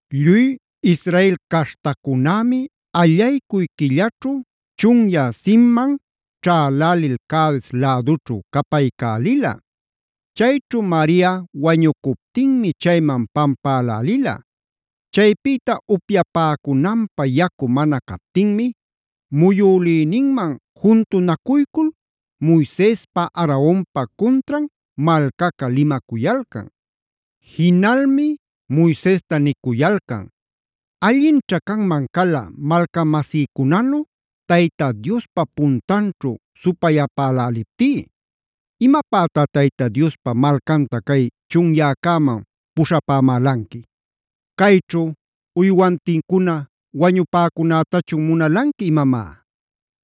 Lluy Israel caśhtacunämi allaycuy quillaćhu chunyä Zinman ćhalälil Cades lädućhu capaycälila. Chayćhu Maria wañucuptinmi chayman pampälälila. Chaypïta upyapäcunanpä yacu mana captinmi muyülïninman juntunacuycul Moisespa Aaronpa cuntran malcaca limacuyalcan. Jinalmi Moisesta nicuyalcan: “¡Allinćha canman cala malcamasïcunanu Tayta Diospa puntanćhu supayapäläliptí! ¿¡Imapätá Tayta Diospa malcanta cay chunyäcäman puśhapämälanqui!? ¿¡Cayćhu uywantincuna wañupäcunätachu munalanqui imamá!?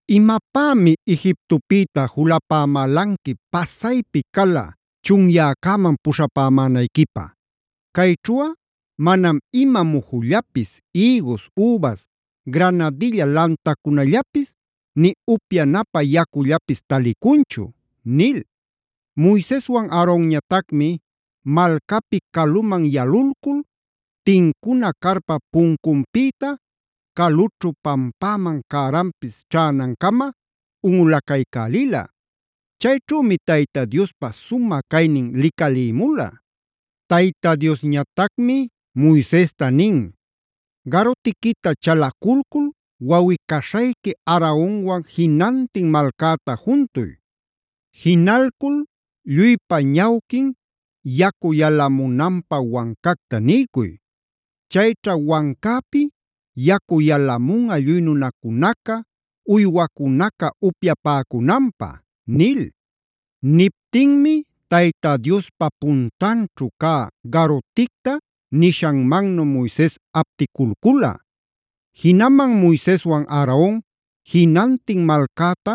¿Imapämi Egiptopïta julapämälanqui pasaypi cala chunyäcäman puśhapämänayquipä? Cayćhuꞌa manam ima mujullapis, ïgus, übas, granadilla lantacunallapis, nï upyanapä yacullapis talicunchu” nil. Moiseswan Aaronñatacmi malcapi caluman yalulcul, tincuna carpap puncunpïta calućhu pampäman cäranpis ćhänancama unꞌulacaycälila. Chayćhümi Tayta Diospa sumä caynin licalïmula. Tayta Diosñatacmi Moisesta nin: “Garutiquita chalaculcul wawꞌi-caśhayqui Aaronwan jinantin malcäta juntuy. Jinalcul lluypa ñawquin yacu yalamunanpä wancacta niycuy. Chayćha wancäpi yacu yalamunꞌa lluy nunacunaca, uywacunaca upyapäcunanpä” nil. Niptinmi Tayta Diospa puntanćhu cä garuticta nishanmannu Moises apticulcula. Jinaman Moiseswan Aaron jinantin malcäta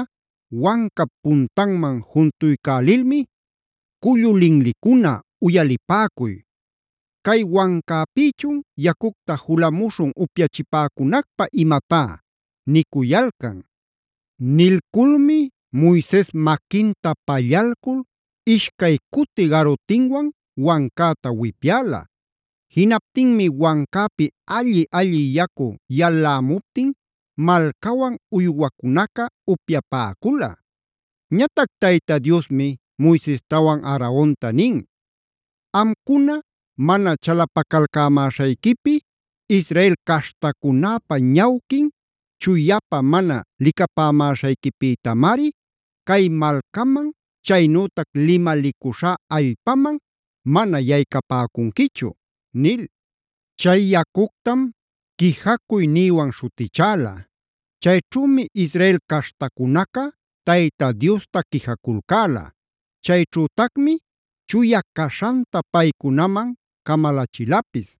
wancap puntanman juntuycälilmi “¡Cullu linlicuna, uyalipäcuy! ¿¡Cay wancäpïchun yacucta julamuśhun upyachipäcunacpä imatá!?” nicuyalcan. Nilculmi Moises maquinta pallalcul ishcay cuti garutinwan wancäta wipyäla. Jinaptinmi wancäpi alli-alli yacu yalämuptin malcawan uywacunaca upyapäcula. Ñatac Tayta Diosmi Moisestawan Aaronta nin: “Amcuna mana chalapacalcämäśhayquipi, Israel caśhtacunäpa ñawquin chuyapä mana licapämäśhayquipïtamari, cay malcaman chaynütac limalicuśhá allpaman mana yaycapäcunquichu” nil. Chay yacuctam “quijacuy”a nïwan śhutichäla. Chayćhümi Israel caśhtacunaca Tayta Diosta quijaculcäla; chayćhütacmi chuya caśhanta paycunaman camalachilapis.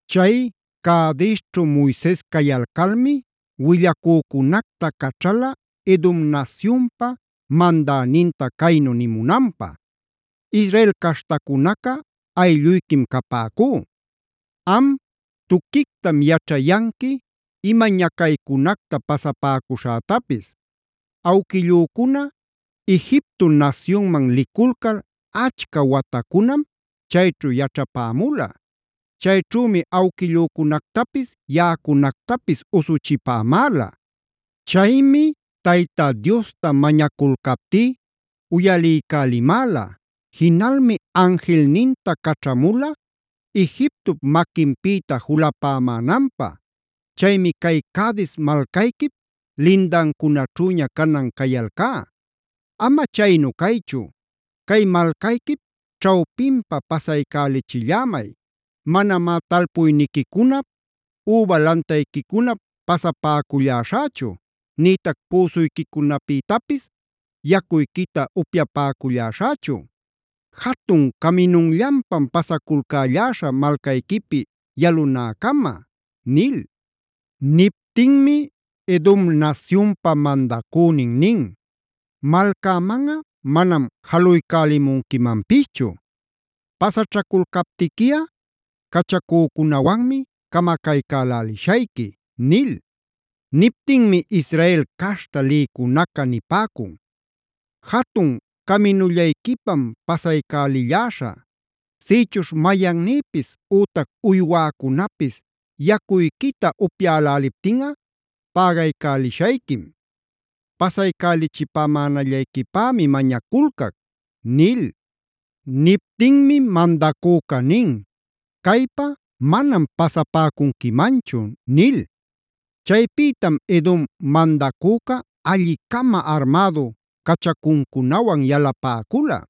Chay Cadesćhu Moises cayalcalmi willacücunacta caćhala Edom nasyunpa mandäninta caynu nimunanpä: “Israel caśhtacunaca aylluyquim capäcú. Am tuquictam yaćhayanqui ima ñacaycunacta pasapäcuśhätapis. Awquillücuna Egipto nasyunman liculcal achca watacunam chayćhu yaćhapämula. Chayćhümi awquillücunactapis yaꞌacunactapis usuchipämäla. Chaymi Tayta Diosta mañaculcaptí uyaliycälimäla. Jinalmi anjilninta caćhamula Egiptop maquinpïta julapämänanpä. Chaymi cay Cades malcayquip lindancunaćhüña canan cayalcá. Ama chaynu caychu, cay malcayquip ćhawpinpa pasaycälichillämay. Manamá talpuyniquicunap üba lantayquicunap pasapäcuśhächu, nïtac püsuyquicunapïtapis yacuyquita upyapäcuśhächu. Jatun caminunllanpam pasaculcälläśhä malcayquipi yalunäcama” nil. Niptinmi Edom nasyunpa mandacünin nin: “Malcämanꞌa manam jaluycälimunquimanpischu. Pasaćhaculcaptiquiꞌa cachacücunawanmi camacaycälälishayqui” nil. Niptinmi Israel caśhta lïcunaca nipäcun: “Jatun caminullayquipam pasaycälilläśhä. Sïchuśh mayannïpis ütac uywäcunapis yacuyquita upyäläliptinꞌa pägaycälishayquim. Pasaycälichipämänallayquipämi mañaculcac” nil. Niptinmi mandacüca nin: “Caypa manam pasapäcunquimanchu” nil. Chaypïtam Edom mandacüca alli-cama armädu cachacuncunawan yalapäcula.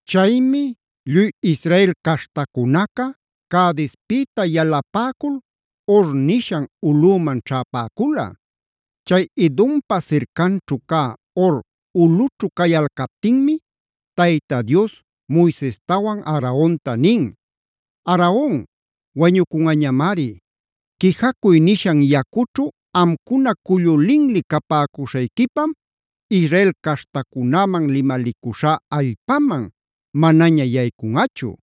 Chaymi lluy Israel caśhtacunaca Cadespïta yalapäcul Hor nishan ulꞌüman ćhäpäcula. Chay Edompa sircanćhu cä Hor ulꞌućhu cayalcaptinmi Tayta Dios Moisestawan Aaronta nin: “Aaron wañucunꞌañamari. Quijacuy nishan yacućhu amcuna cullu linli capäcuśhayquipam Israel caśhtacunäman limalicuśhá allpaman manaña yaycunꞌachu.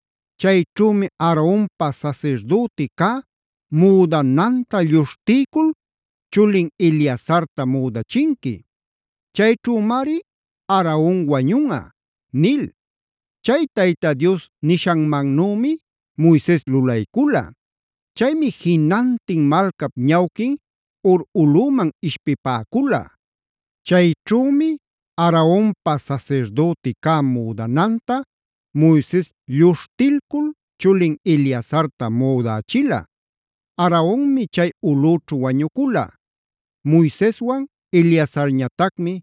Chayćhümi Aaronpa sasirdüti cä müdananta lluśhtiycul chulin Eleazarta müdachinqui. Chayćhümari Aaron wañunꞌa” nil. Chay Tayta Dios nishanmannümi Moises lulaycula. Chaymi jinantin malcap ñawquin Hor ulꞌüman ishpipäcula. Chayćhümi Aaronpa sasirdüti cä müdananta Moises lluśhtilcul chulin Eleazarta müdächila.c Aaronmi chay ulꞌüćhu wañucula.d Moiseswan Eleazarñatacmi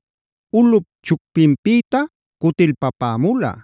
ulꞌup chupquinpïta cutilpapämula.